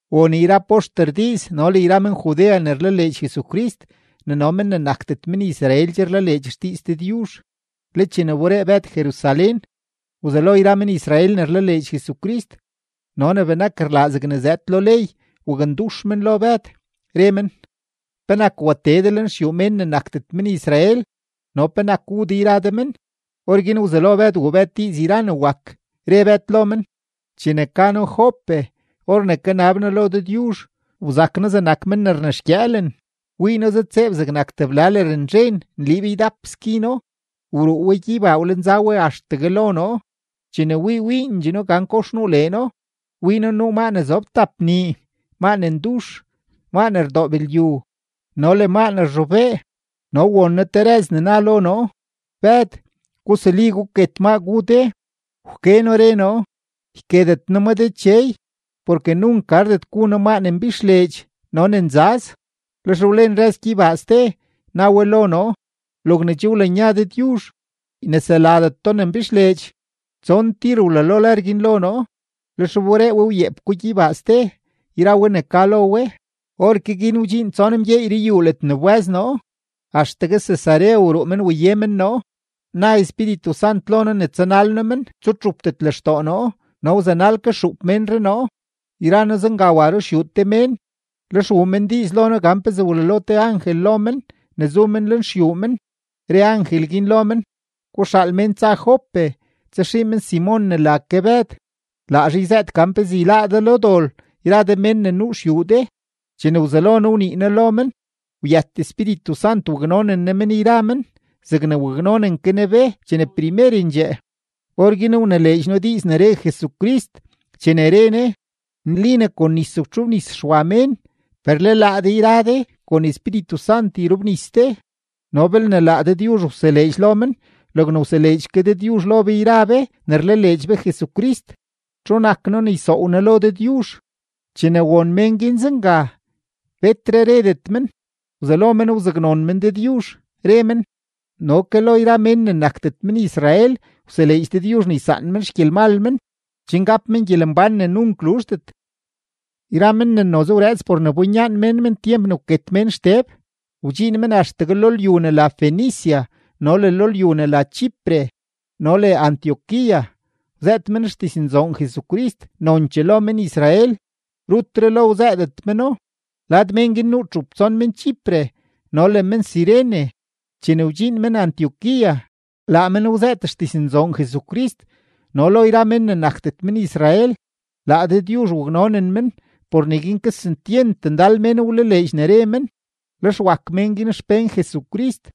Won yra poxter diiz no le yra men-Judea ne rlaleedx Jesucrist, ne no mén ne nakdet men-Israel che rlaleedx xdiiz Dëdyuzh. Le chene wberee Bëd Jerusalén, wzelo yra men-Israel ne rlaleedx Jesucrist no ne benak rlaa zegne zëëd lo ley wakndux men lo Bëd, re men: ―¿Penak watee de lenxyuu mén ne nakdet men-Israel no penak wu de yra de men? Orguin wzelo Bëd wuu Bëd diiz yra ne wak, re Bëd lo men: ―Chene ka noo Jope, or ne kanab noo lo Dëdyuzh, wzak noo zegnak men ne rnexgyëëlen, wii noo zëdtseeb zegnak tebla lërnzhen nliib ydap skino, wruu we gyeybaa wlenza we axtegue lo noo. Chene wii wiindxee noo gan kox nuu leeno, wii noo nuu maa ne zob tap nii, maa ne ndux, maa ne rdoob lyu, no le maa ne rzhobee. No won noo te rëz ne na lo noo: “Bëd, gusuli, guket maa gu de.” Wke noo, re noo: “Yketet noo ma Dechey, porke nunk gardet gu noo maa ne mbixleedx no ne nzaz.” Lex wlen rëz gyeybaa ste, na we lo noo: “Logne che wlanya Dëdyuzh, yneseladet do ne mbixleedx.” Tson tir wlalo lër guin lo noo, lex wberee we wyeep ko gyeybaa ste yra we ne ka lo we. Orke guin wdxiin tson mgyeey ruyuu ledne wbë́z noo, axtegue Cesarea wruu men waye men noo. Na Espíritu Sant lo noo ne tsanal noo men, tsutxupdet lextoo noo, no wzanal ke xuup ménree noo, yra noo zenga wa ruxyuu te mén. Lex wuu men diiz lo noo gan pezee wlalo te angel lo men ne zu men lenxyuu men, re angel guin lo men: “Guxaal mén tsa men Jope tsaxii men Simon ne la ke Bëd; laa zhaa yzëët gan pezee yláá de lo dol yra de mén ne nuu xyuu de.” Chene wzelo noo wnii noo lo men, wyët Espíritu Sant waknonen Ne men yra men zegne waknonen ke Ne be chene primerendxee. Orguin wnileedx noo diiz ne re Jesucrist chene re Ne: “Nli ne kon nis wtxobnis Xwa mén, per le laa de yra de kon Espíritu Sant yrobnis de.” No belne laa Dëdyuzh wseleedx lo men logne wseleedx ke Dëdyuzh lo be yra be ne rlaleedx be Jesucrist, ¿txu nak noo ne ysoow noo lo Dëdyuzh? Chene won mén guin zenga, betre redet men, wzelo men wzaknon men Dëdyuzh, re men: ―No ke lo yra mén ne nakdet men-Israel wseleedx Dëdyuzh ne ysaan men xgyelmal men, chen gap men gyelembán ne nunk luzhdet. Yra men ne noze wrëëts por ne winyaan mén men tyemp ne wket mén Xteb, wdxiin men axtegue lo lyu ne la Fenicia no le lo lyu ne la Chipre no le Antioquía, wzëët men xdiznzoon Jesucrist nonchee lo men-Israel, rutre lo wzëëdet meno. Lad mén guin nuu txup tson men-Chipre no le men-Cirene. Chene wdxiin men Antioquía, laa men wzëët xdiznzoon Jesucrist no lo yra mén ne nakdet men-Israel. Laa Dëdyuzh waknonen men; por neguin kesentyent ndal mén wlaleedx ne re men, lex wak mén guin xpén Jesucrist.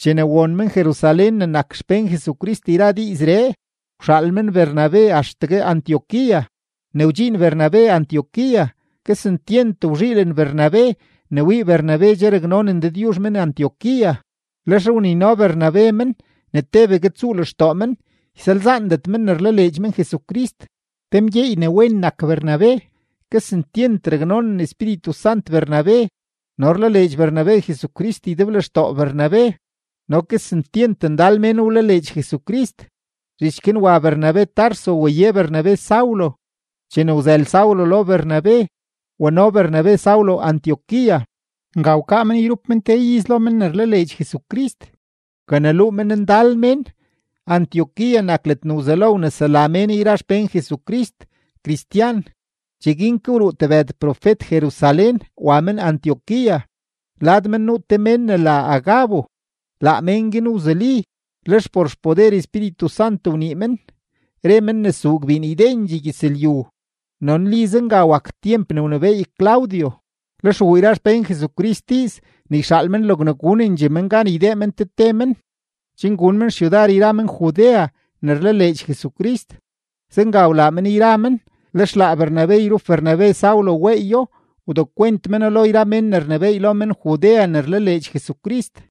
Chene won men-Jerusalén ne nak xpén Jesucrist yra diizree, wxaal men Bernabe axtegue Antioquía. Ne wdxiin Bernabe Antioquía, kesentyent wzhiilen Bernabe ne wii Bernabe che raknonen Dëdyuzh men-Antioquía; lex wnino Bernabe men ne tebegue tsuu lextoo men, ysalzaandet men ne rlaleedx men Jesucrist. Te mgyeey ne wen nak Bernabe, kesentyent raknonen Espíritu Sant Bernabe no rlaleedx Bernabe Jesucrist ydeblextoo Bernabe. No kesentyent ndal mén wlaleedx Jesucrist. Zhich guin wa Bernabe Tarso waye Bernabe Saulo; chene wzël Saulo lo Bernabe, wano Bernabe Saulo Antioquía. Nga wkaa men yrup men te iz lo men ne rlaleedx Jesucrist, wkaneluu men ndal mén. Antioquía nak ledne wzelo wnesela mén yra xpén Jesucrist “cristian”. Cheguin ke wruu tebëd profet Jerusalén wa men Antioquía. Lad men nuu te mén ne la Agabo. Laa mén guin wzuli, lex por xpoder Espíritu Sant wnii men, re men ne zuu gbiin ydendxee gyëzlyu. No nli zenga wak tyemp ne wnebééy Claudio. Lex wuu yra xpén Jesucrist diiz ne yxaal men logne gunendxee men gan ydee men te te men, chen gun men xyudar yra men-Judea ne rlaleedx Jesucrist. Zenga wlaa men yra men, lex laa Bernabe yrup Bernabe Saulo weeyo wdekwent meno lo yra mén ne rnebééy lo men-Judea ne rlaleedx Jesucrist.